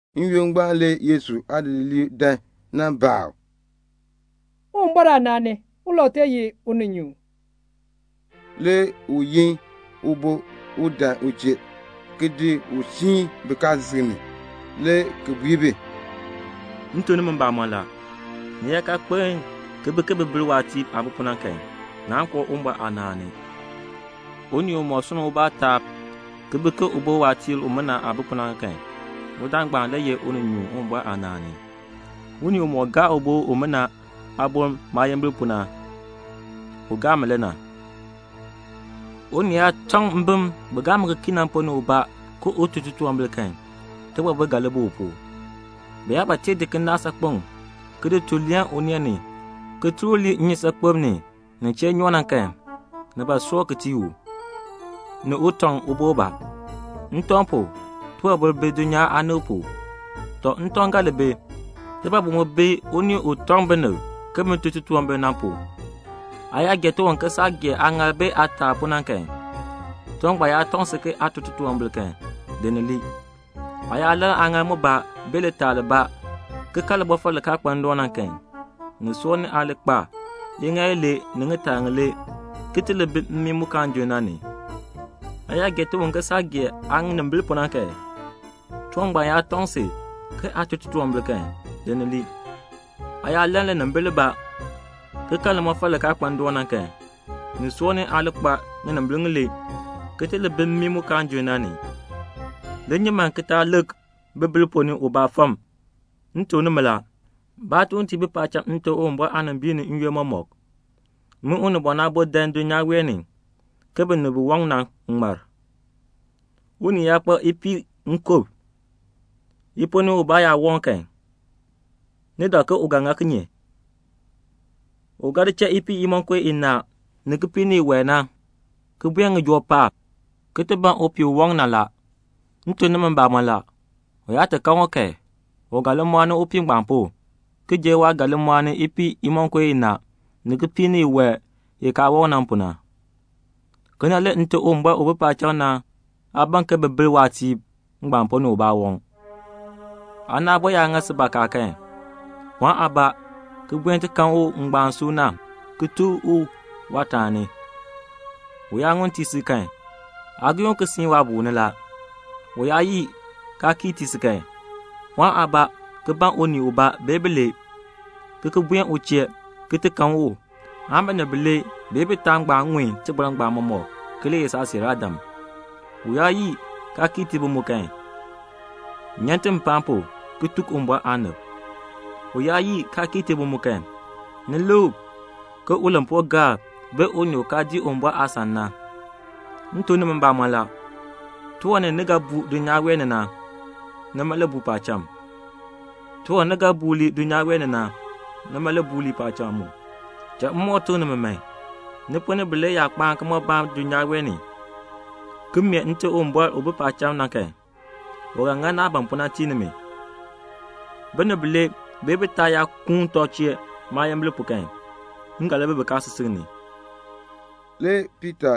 N-yoonn ngbaan le Yesu aadidiliib dan nan baa u, "Uwumbɔr aanaan ni, ulau tee ye uninyuun?" Le u yin ubo un dan u chee, ki di u siin bikaasisik ni, le ki bui bi, "M tuk nimi mbamɔn la, ni yaa kaa kpeln ki li bi ke bibilb waatiir aah bi pu na kan, naan koo Uwumbɔr aanaan ni. Unii umɔk sunn ubaa taab ki bi ke ubo waatiir umina aah bi pu na, udaan ngbaan le ye uninyuun Uwumbɔr aanaan ni. Unii umɔk gaa ubo umina aaboln maayimbil pu na, u gaa mi le na." "Mbim bi gaa mi ki kii na, unii yaa tɔŋ bi ponn ni ubaa ke un tun titunwambir kan, tibɔbil ga li bi u pu. Bi yaa ba tee di kinaak saakpeŋ ki di tul leen uneen ni, ki tur u lii nnyusaakpem ni, nin chee nyoo na kan, ni soor ki tii u, ni u tɔŋ ubo ubaa. Ntɔŋ pu, tibɔbil bi dulnyaa aanib pu. See ntɔŋ li bi. Tibɔbil mu bi unii u tɔŋ binib ke bin tun titunwambir na pu. "Aa yaa gee tiwan ke saah gee aaŋaal bee aataal pu na kan, tiwan ngbaan yaa tɔŋ si ke aa tun titunwambir kan, di ni lii. Aa yaa lann ŋŋaal mbaa aan litaal libaa, ki kan limɔfal li kaa kpa ndoon na kan, ni soor ni aa li kpa iŋaal ilee ni ŋitaa ŋilee ki ti li bi mmii mu kaan junn na ni. Aa yaa gee tiwan ke saah gee aanimbil pu na kan, tiwan ngbaan yaa tɔŋ si ke aa tun titunwambir kan, di ni lii. Aa yaa lann linimbil libaa, ki kan limɔfal li kaa kpa ndoon na kan, ni soor ni aa li kpa ŋinimbil ŋilee, ki ti li bi mmii mu kaan junn na ni." "Li nyi man ki taa lik bibilb ponn ni ubaa fam. M tuk nimi la, baatuuntiib bi paacham Nte Uwumbɔr aanimbiin ni n-yoonn mɔmɔk. [ Min Unibɔn Aabo dan dulnyaa wee ni ke binib bi waŋ na ŋmar.] "Unii yaa kpa ipiih nkub, i ponn ni ubaa yaa waŋ kan, ni dak ke u ga ŋa kinye? U ga di cha ipiih imonko inaa ni kipiik ni iwae, ki buen ŋijoo paab, ki ti ban upiih u waŋ na la. M tuk nimi mbamɔn la, u yaa ti kan u kan, u ga li mɔɔni upiih ngbaan pu, ki jer waah ga li mɔɔni ipiih imonko inaa ni kipiik ni iwae i kaa waŋ na pu. Kena le Nite Uwumbɔr u bi paacham na aa ban ke bibilb waatiib ngbaan ponn ni ubaa waŋ." "Aana aabo yaa ŋa si bakaa kan, pɔɔn aabaa ki buen ti kan u ngbaan suuna ki tuk u waataani. U yaa ŋun tii si kan, aa giin u ki siin waabuul ni la. U yaa yii, kaa kii tii si kan, pɔɔn aabaa ki yoor unii ubaa bee bilee, ki ki buen u chee ki ti kan u, aan binib bilee bee bitaa ŋun tibɔr ngbaan mɔmɔk ki li ye saasiiraadam. U yaa yii, kaa kii tii bi mu kan, nyan ti mpaan pu ki tuk Uwumbɔr aanib. U yaa yii, kaa kii tii bi mu kan, ni lik u ke ulampuugaar aan unii u kaa dii Uwumbɔr aasan na. "M tuk nimi mbamɔn la, tiwan ni, ni ga buu dulnyaa wee ni na, nima le buu paacham. Tiwan ni, ni ga buur lii dulnyaa wee ni na, nima le buur lii paacham mu. "Cha m moo tuk nimi, ni ponn ni bilee yaa kpaa kimɔbaan dulnyaa wee ni, ki mee Nte Uwumbɔr u bi paacham na kan, u ga ŋa naah ban pu na ki tii nimi. Binib bilee bee bitaa yaa kuun tɔb chee maayimbil pu kan, m ga li bi bikaasisik ni." Le Piita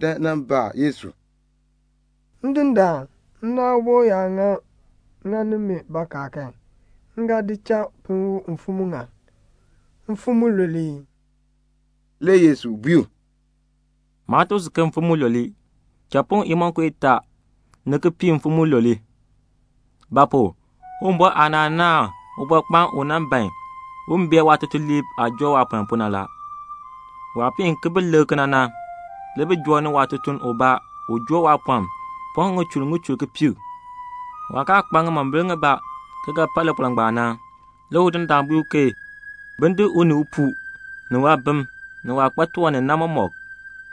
dan nan baa Yesu, "Ndindaan, nna aabo yaa ŋani mi bakaa kan, m ga di cha pinn u mfim muŋa? Mfim mulule ee?" Le Yesu bui u, "Maa tuk si ke mfim mulule. Cha pinn u imonko itaa ni kipiik mfim mulule. Ba pu? Uwumbɔr aanaan naahn ubɔrkpaan ubaa u ban un bee waatutuliib aah joo waapɔln pu na. Waah piin ki bi lik kena na, le bi joo ni waatutuln ubaa u joo waapɔln pɔŋ ŋichur ŋichur kipiik. Waah kaa kpa ŋimombil ŋibaa ki ga pa lipɔln ngbaan na, nima pu na le udindaan bui ke bin di u ni upuu ni waabim ni waah kpa tiwan ni na mɔmɔk,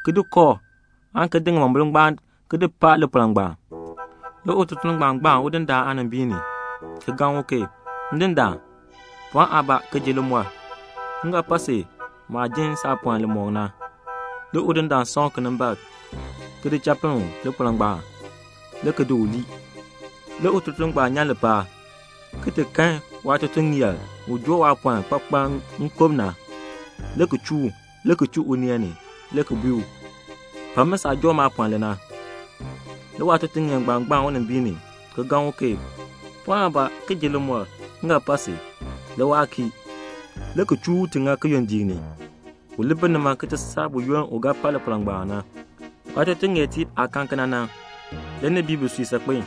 ki di kooh, aan ki di ŋimombil ngbaan ki di pa lipɔln ngbaan. Le ututuln ngbaan gbaan udindaan aanimbiin ni, le ki gaŋni u, 'Ndindaan, pɔɔn aabaa ki ji limɔr. M ga pa si maah jin saapɔln li mɔk na.' Le udindaan san u kinimbaak, le ki di cha pinn u lipɔln ngbaan, le ki di u lii. "Le ututuln ngbaan nyan lipaal, ki kan waatutuŋeer ubaa u joo waapɔln kpakpaln nkub na, le ki chuu u, le ki chuu uneen ni, le ki bui u, 'Pa mi saah joo maapɔln li na.' Le waatutuŋeer ngbaan gbaan unimbiin ni, ki gaŋni u, 'Pɔɔn aabaa ki ji limɔr. M ga pa si.' Le waa kii, le ki chuu u ki ti di ŋa kiyondiik ni, u li bi nima ki ti saa buyoonn u ga pa lipɔln na. Waatutuŋeertiib aah kan kena na, le ni bii bisui saakpen a.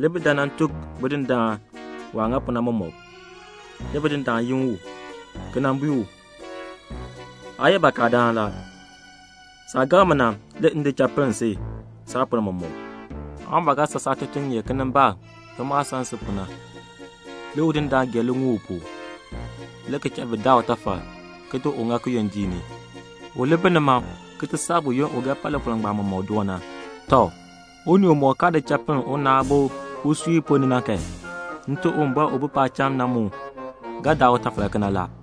Le bi dan nan tuk bidindaan waah ŋa pu na mɔmɔk. Le bidindaan yi u, le ki bui u, 'Aa ye bakadaan la. Saah gaŋ mi na, le m di cha pinn si saapɔln mɔmɔk. Aa mu ba ga san saatutuŋeer kinimbaak ke maah san si pu na.' Le udindaan gee liŋuul u pu, le ki cha bi daa utafal ki di ŋa kiyondiik ni, u li bi nima ki ti saa buyoonn u ga pa lipɔln ngbaan mɔmɔk ki doo na. "Tɔ, unii umɔk kaa di cha pinn una aabo usui ponn ni na kan, Nte Uwumbɔr u bi paacham na mu ga daa utafal kena la."